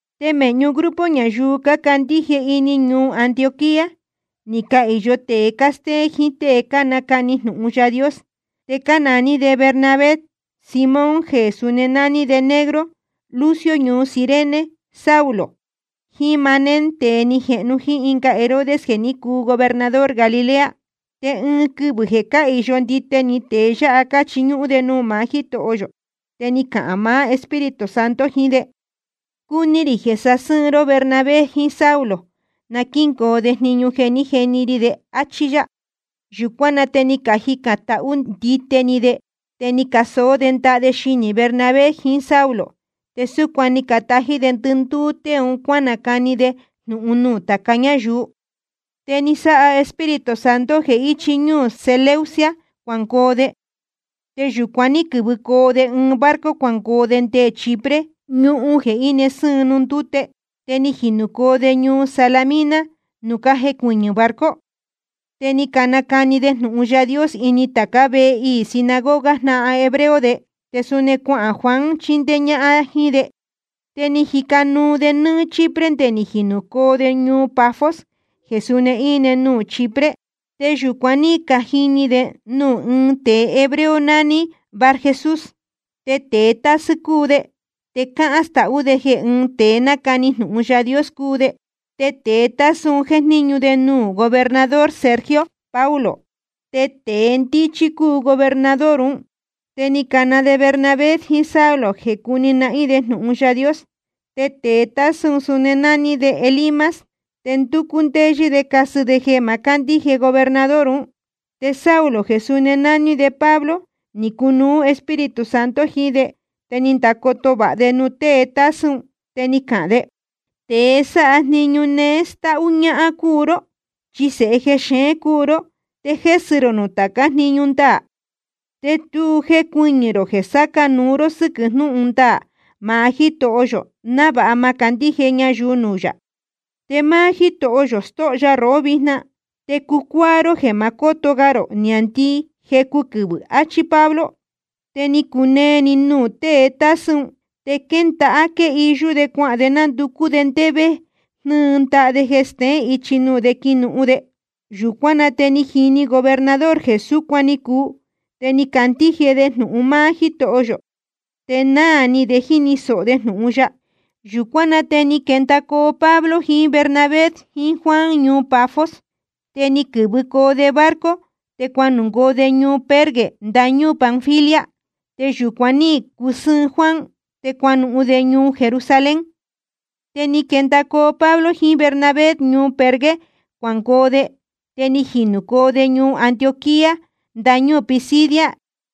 Te mēhñu grupo ñayuu cácandíje ini ñuu Antioquía ni cahīyo tēe cástéén jiín tée cánacani jnūhun Yaā Dios, te cánaní de Bernabé, Simón jeē suni nání de Negro, Lucio ñuu Cirene, Saulo, jiín Manaén tēe ni jehnu jíín ɨnga Herodes jeē ní cuu gobernador Galilea. Te ɨɨn quɨvɨ̄ jeē cáhīyo ndite ni tēe yáha cáchiñúhún de nuū maá Jítoho yō, te ni cahān maá Espíritu Santo jiín de: Cúní rī jeē sasɨ́ɨn ró Bernabé jiín Saulo na quíngoo de jniñu jeē ní jeni ri de, áchí yá. Yūcuán na te ni cajicān tahú ndite ni de, te ni casoó de ndaha de xinī Bernabé jiín Saulo, te súcuan ni catají de ndɨndúú tée ún cuanacani de jnūhun nuū tāca ñáyuu. Te ni sáha Espíritu Santo jeē íchi ñúū Seleucia cuangoo de. Te yūcuan ní quɨ̄vɨcoo de ɨɨn barco cuangoo de nde Chipre, ñuhun jeē íne sɨ́ɨn nuū ndúte. Te ni jinūcoo de ñuu Salamina nuū cájecuɨñɨ̄ barco, te ni canacani de jnūhun Yaā Dios ini tācá vehe iī sinagoga jnáhan hebreo de. Te suni cuahān Juan chindéé ñáhán jíín de. Te ni cajica nuu de nɨ́ɨ́‑ni Chipre nde ni jinūcoo de ñuu Pafos jeē suni íne nuū Chipre. Te yūcuan ní cajini de nuū ɨ́ɨn tēe hebreo nání Barjesús. Te tēe tásɨ́ cúu de, te cáhán stahú de jeē ɨ́ɨn tēe nácani jnūhun Yaā Dios cúu de. Te tēe tásɨ́ un jéjníñu de nuū gobernador Sergio Paulo, te tēe ndíchí cúu gobernador ún. Te ni cana de Bernabé jiín Saulo jeē cúni nahín de jnūhun Yaā Dios. Te tēe tásɨ́ un suni nání de Elimas. Te ndúcú ndéyɨ́ de casɨ de jeē ma cándíje gobernador ún. Te Saulo jeē suni nání de Pablo, ni cunuú Espíritu Santo jiín de, te ni ndacoto vāha de nuū tée tásɨ́ un. Te ni cahān de: Tēe sáha jniñu néé stáhú ñáhán cúu ró, chi sēhe jexeén cúu ró te jésɨ rō nuū tācá jniñu ndaā. Te tu jécuɨñɨ̄ rō jeē sáca núu ró sɨ́quɨ̄ jnúhun ndaā maá Jítoho yō návāha ma candíje ñayuu nuū yā. Te máá Jítoho yō stóho ya rohó vijna, te cucuáá ró jeē ma cóto ga rō niāndii jecu quɨvɨ̄, achí Pablo. Te ni cunee‑ni nuū tée tásɨ́ un, te quéndāha quéhiyú de cuahān de ndúcú de ndé vé jnɨ́ɨ ndaha de stéén ichi nuū de quinuhun de. Yūcuán na te ni jini gobernador jeē súcuan ni cuu, te ni candíje de jnūhun máá Jítoho yō, te náā ni de jíni sōho de jnūhun ya. Yūcuán na te ni quendacoo Pablo jiín Bernabé jiín Juan ñuu Pafos, te ni quɨ̄vɨcoo de barco te cuangoo de ñuu Perge ndañúū Panfilia. Te yūcuan ní cusɨ́ɨn Juan, te cuanuhun de ñuu Jerusalén. Te ni quendacoo Pablo jiín Bernabé ñuu Perge cuangoo de, te ni jinūcoo de ñuu Antioquía ndañúū Pisidia.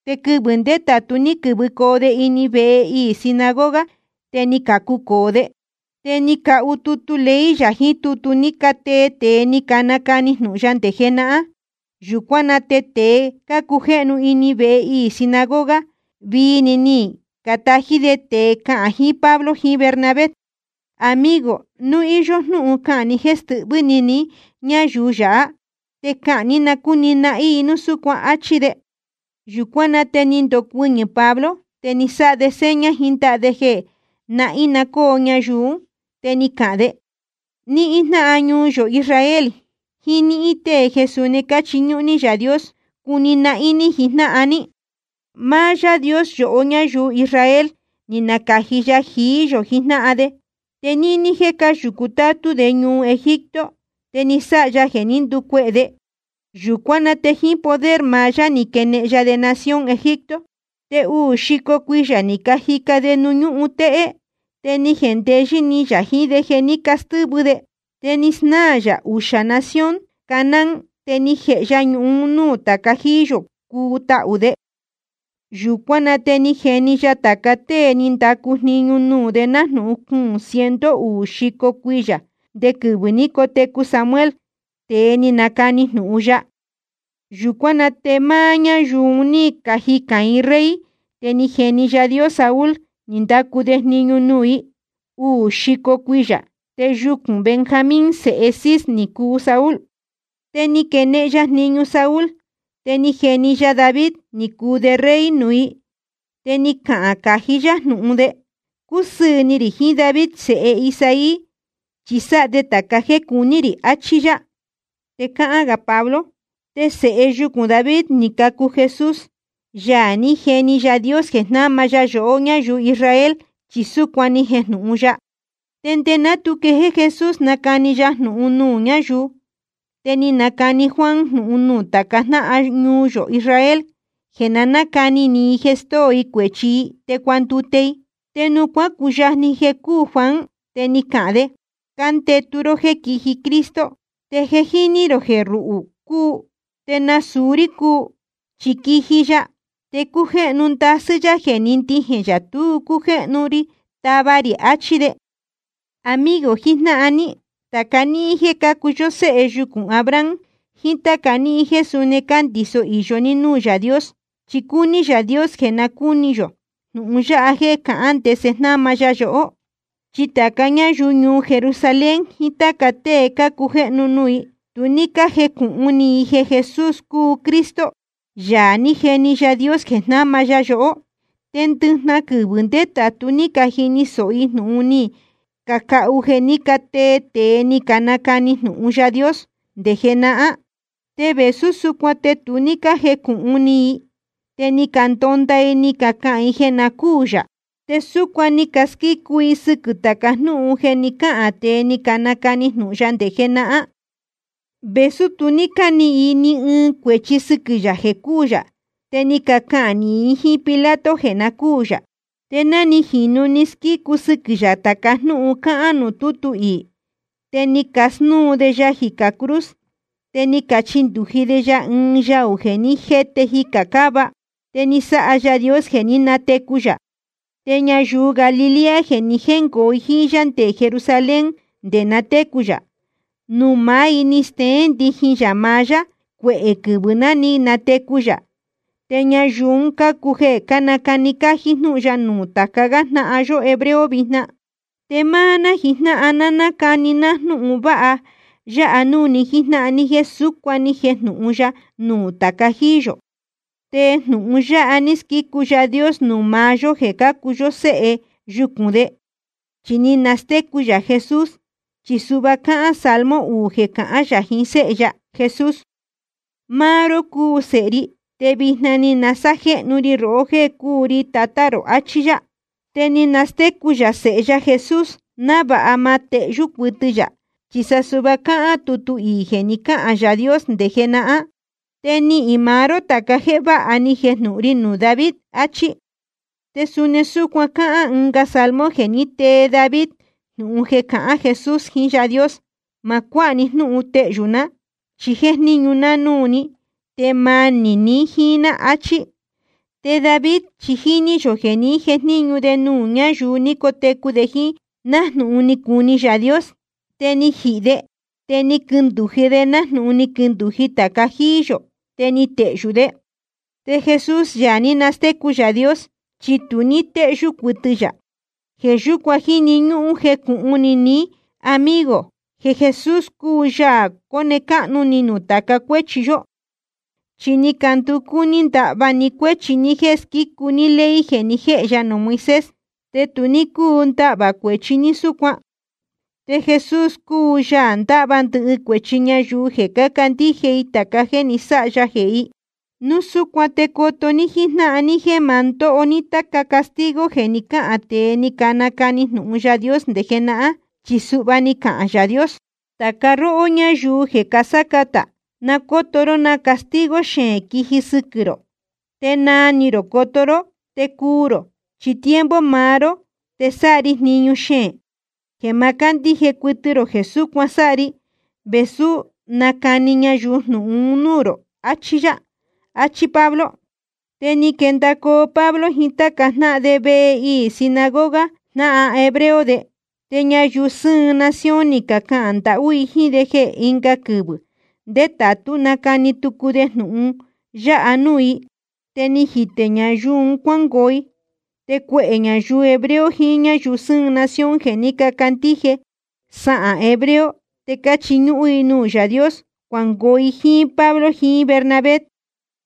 Te quɨvɨ̄ ndétātu ní quɨ̄vɨcoo de ini vehe iī sinagoga, te ni cacucōo de. Te ni cahu tutu ley yā jiín tutu ní catee tēe ni canacani jnūhun ya nde jenahán. Yūcuán na te tēe cácujéhnu ini vehe iī sinagoga, vii‑ni ni catají de tēe cahān jiín Pablo jiín Bernabé: Amigo, núu íyó jnúhun cahān ni jéē stɨhvɨ́ ni ni ñáyuu yáha, te cahān ní na cúni nahín i núu súcuan, áchí de. Yūcuán na te ni ndocuɨñɨ̄ Pablo te ni sáha de seña jiín ndaha de jeē nahín‑ni coo ñayuu ún, te ni cahān de: Níhín jnáhan ñuu yō Israel jiín níhín tée jeē suni cáchiñúhún ní Yaā Dios, cuni nahín ní jijnáhan ní. Máá Yáā Dios yohó ñáyuu Israel, ni nacāji ya jií yō jijnáhan de. Te níní jéē cáyūcu tátú de ñuu Egipto, te ni sáha ya jeē ní nducuehē de. Yūcuán na te jíín poder maá yá ni quenehen ya de nación Egipto. Te uū xico cuiyā ni cajica de nuū ñúhun téhé, te ni jendeyɨ́ ni yā jiín de jeē ní castɨ́vɨ de. Te ni snáā yā uxā nación Canaán, te ni jēhe ya ñuhun un núū tāca jíí yō cúu tahū de. Yūcuán na te ni jeni ya tāca tée ni candacu jniñu nuū de nájnūhun cuūn ciento uū xico uxī cuiyā, nde quɨvɨ̄ ní cotecu Samuel, tēe ni nacani jnūhun ya. Yūcuán na te máá ñáyuu un ní cajicān i ɨɨn rey, te ni jeni Yaā Dios Saúl ni ndacu de jniñu nuū i uū xico cuiyā. Te yucūn Benjamín sēhe Cis ni cuu Saúl. Te ni quenehen ya jniñu Saúl, te ni jeni ya David ni cuu de rey nuū i. Te ni cahān cají yá jnūhun de: Cúsɨɨ̄ ni rī jiín David sēhe Isaí, chi sáha de tāca jéē cuní rī, achí yá. Te cáhán gā Pablo: Te sēhe yucūn David ni cacu Jesús, Yaā ní jeni Yaā Dios jeē jnáma ya yohó ñáyuu Israel, chi súcuan ni jejnūhun ya. Te nde ná tu quejéé Jesús nacani ya jnūhun nuū ñáyuu, te ni nacani Juan jnūhun nuū tāca jnáhan ñuu yō Israel jeē na nácani ni i jeē stóo i cuēchi i, te cuandute i. Te nuū cuácuyajni jeē cúū Juan, te ni cahān de: Cándētu ró jéē quíji Cristo, te jéni ni rō jeē ruhū cúu, te nasūu rí cúu. Chi quiji ya, te cújéhnu ndasɨ́ yá jeē ni ndijēn yā tu cújéhnu ri tava rī, achí de. ’Amigo jijnáhan ní, tāca níhín jéē cácuu yó séhe yucūn Abraham jiín táca níhín jéē suni cándiso īyo ní núū Yaā Dios, chi cúní Yaā Dios jeē na cúni yō jnūhun yáha jeē cáhán ndese jnáma ya yohó. Chi tāca ñáyuu ñuu Jerusalén jiín táca tée cácujéhnu nuū i, tu ní cájecūhun ni i jeē Jesús cúu Cristo, Yaā ní jeni Yaā Dios jeē jnáma ya yohó. Te ndɨjnahan quɨvɨ̄ ndétātu ní cajini sōho i jnūhun ni cacahu jeē ní catee tēe ni canacani jnūhun Yaā Dios nde jenahán. Te vēsú súcuan te tu ní cájecūhun ni i, te ni candonda i ni cacahān i jeē na cúū yā. Te súcuan ni casquícu i sɨquɨ̄ tāca jnúhun jeē ní cacahān tēe ni canacani jnūhun ya nde jenahán. Vēsú tu ní cánihīn i ni ɨɨn cuēchi sɨquɨ̄ yā jeē cúū yā, te ni cacahān nīhin i jíín Pilato jeē na cúū yā. Te ná ni jīnu ni squícu sɨquɨ̄ yā tāca jnúhun cáhán nuū tútu iī, te ni casnúu de ya jicā cruz, te ni cachindūji de ya ɨɨn yaū ní jete jicā cáva. Te ni sáha Yaā Dios jeē ní natecu yā. Te ñayuu Galilea jeē ni jéngoo jíín yá nde Jerusalén nde na técu yā, nuū maá i ni steén ndijin yā maá yá cuehē quɨvɨ̄ ná ni natecu yā, te ñayuu un cácuu jeē cánacani cájí jnúhun ya nuū táca gá jnáhan yó hebreo vijna. ’Te máá ná jijnáhan ná cánacani ná jnúhun vāha yáha núū ni jíjnáhan ní jéē súcuan ni jejnūhun ya nuū tāca jíí yō. Te jnūhun yáha ní squícu Yaā Dios nuū maá yó jeē cácuu yó séhe yucūn de, chi ni nastécu yā Jesús. Chi suhva cáhán salmo uū jeē cahán yā jiín Séhe ya Jesús: Máá ró cúu Sēhe ri, te vijna ni sajéhnu ri rohó jéē cúu ri Tatá rō, achí yá. Te ni nastécu yā Sēhe ya Jesús návāha ma tehyú cuɨtɨ yā, chi suhva cáhán tutu iī jeē ni cáhān Yaā Dios nde jenahán: Te nihīn maá ró tāca jéē váha ni jejnūhun ri nuū David, áchí. Te suni súcuan cáhán ɨnga salmo jeē ní tee David jnūhun jeē cahán Jesús jiín Yáā Dios: Ma cuáha ni jnúhun tehyū ná, chi jéjníñu ná núū ní te manī ni jíín ná, achí. Te David chi jíní yō jeē ní jejníñu de nuū ñáyuu ní cotecu de jíín, nájnūhun ni cuni Yaā Dios. Te ni jihī de, te ni quindūji de nájnūhun ni quindūji tāca jíí yō, te ni tehyū de. Te Jesús, Yaā ní nastécu Yaā Dios, chi tu ní téhyú cuɨtɨ yā. Jeē yúcuan jíni ñúhún jecūhun ni ní, amigo, jeē Jesús cúu Yaā cóne cáhnu ni nuū tāca cuéchi yó. Chi ni canducú ní ndahva ni cuéchi ní jéē squícu ní ley jeē ni jéhe ya nuū Moisés, te tu ní cúu ndahvā cuēchi ní súcuan. Te Jesús cúu Yaā ndáhva ndɨhɨ cuēchi ñayuu jeē cácandíje i tāca jéē ni sáha ya jehē i. Núu súcuan te coto ní jíjnáhan ní jéē ma ndóho ní táca castigo jeē ní cacahān tēe ni canacani jnūhun Yaā Dios nde jenahán, chi suhva ni cahān Yaā Dios: Tāca róhó ñáyuu jeē casácatā, na cóto ró na castigo xeēn quiji sɨquɨ̄ rō, te naa ni rō coto ró, te cuu rō. Chi tiempo maá ró te sáha ri jniñu xeēn jeē ma cándíje cuɨtɨ rō jeē súcuan sáha ri vēsú nacani ñayuu jnūhun un núū rō, achí yá. Achí Pablo. Te ni quendacoo Pablo jiín táca jnáhan de vehe iī sinagoga jnáhan hebreo de. Te ñayuu sɨ́ɨn nación ni cacahān ndahú i jíín de jeē ɨnga quɨvɨ̄ ndétātú nacani tucu de jnūhun yáha núū i. Te ni jitē ñayuu un cuángoo i. Te cuehē ñayuu hebreo jiín ñáyuu sɨ́ɨn nación jeē ní cacandíje sahān hebreo te cáchiñúhún i nuū Yaā Dios, cuangoo i jíín Pablo jiín Bernabé.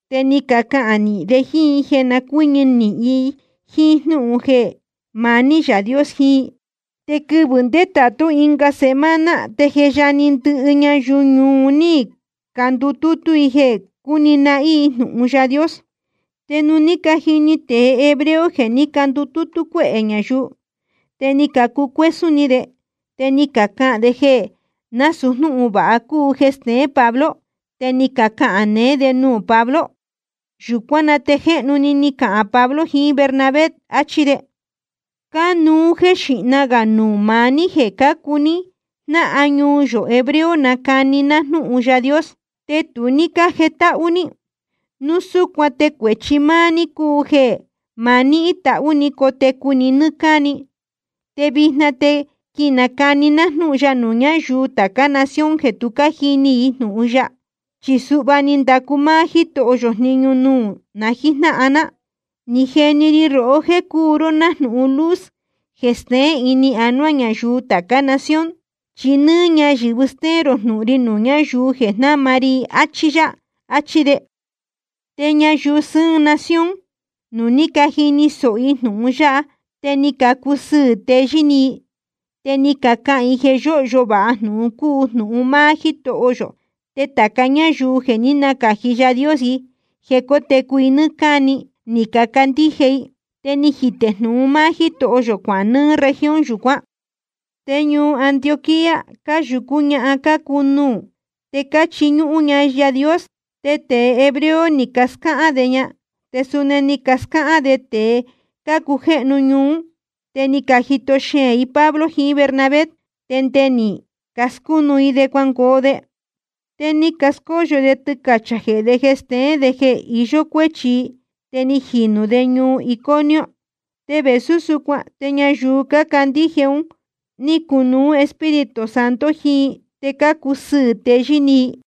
Te ni cacahān nīhin de jíín i jeē na cuɨ́ñɨ nīhin i jíín jnúhun jeē maní Yaā Dios jiín i. Te quɨvɨ̄ ndétātú ɨnga semana te je yajni ndɨhɨ ñayuu ñuu un ní candutútú i jeē cúni nahín i jnūhun Yaā Dios. Te nuū ní cajini tēe hebreo jeē ní candutútú cuéhē ñayuu, te ni cacucuésún ni de, te ni cacahān de jeē násūu jnúhun vāha cúu jeē steén Pablo, te ni cacahān neé de nuū Pablo. Yūcuán na te jéhnu-ni ni cacahān Pablo jiín Bernabé, áchí de: Cánuú jéē xíhna gā nuū maá ní jeē cácuu ní jnáhan ñuu yō hebreo nacani ná jnúhun Yaā Dios, te tu ní cájetáhú ní. Núu súcuan te cuēchi máá ní cúu jeē ma nihín tahú ni cotecu ni nɨ́ɨ́ cáni. Te vijna te quinacani ná jnúhun ya nuū ñáyuu tācá nación jeē tu cájini i jnūhun ya. Chi suhva ni ndacu máá Jítoho yō jniñu nuū na jíjnáhan ná: Ni jeni ri rohó jéē cúu ró nájnūhun luz jeē steén ini anuá ñayuu tācá nación, chi nɨ́ɨ́ ñayɨ̄vɨ stéén rō jnūhun ri nuū ñáyuu jeē jnáma ri i, áchí yá. Achí de. Te ñayuu sɨ́ɨn nación, nuū ní cajini sōho i jnūhun yáha te ni cacusɨɨ̄ teyɨ́ ni i. Te ni cacahān i jeē yōhyo vāha jnūhun cúu jnūhun máá Jítoho yō, te tāca ñáyuu jeē ní nacāji Yaā Dios i jeē cótecu i nɨ́ɨ́ cáni, ni cacandíje i. Te ni jitē jnūhun máá Jítoho yō cuahān nɨɨ́ región yūcuán. Te ñuu Antioquía cáyūcú ñahan cácuu nuū te cáchiñúhún ña Yaā Dios. Te tēe hebreo ni cascáhán de ña, te suni ni cascáhán de tēe cácujéhnu ñuu ún, te ni cajito xeēn i Pablo jiín Bernabé te nde ni cascúnu i de cuangoo de. Te ni cascóyo de tɨcachā jehē de jeē steén de jeē iyó cuéchi i. Te ni jinūcoo de ñuu Iconio. Te vēsú súcuan te ñayuu cácandíje un ní cunuú Espíritu Santo jiín i, te cácusɨɨ̄ teyɨ́ ni i.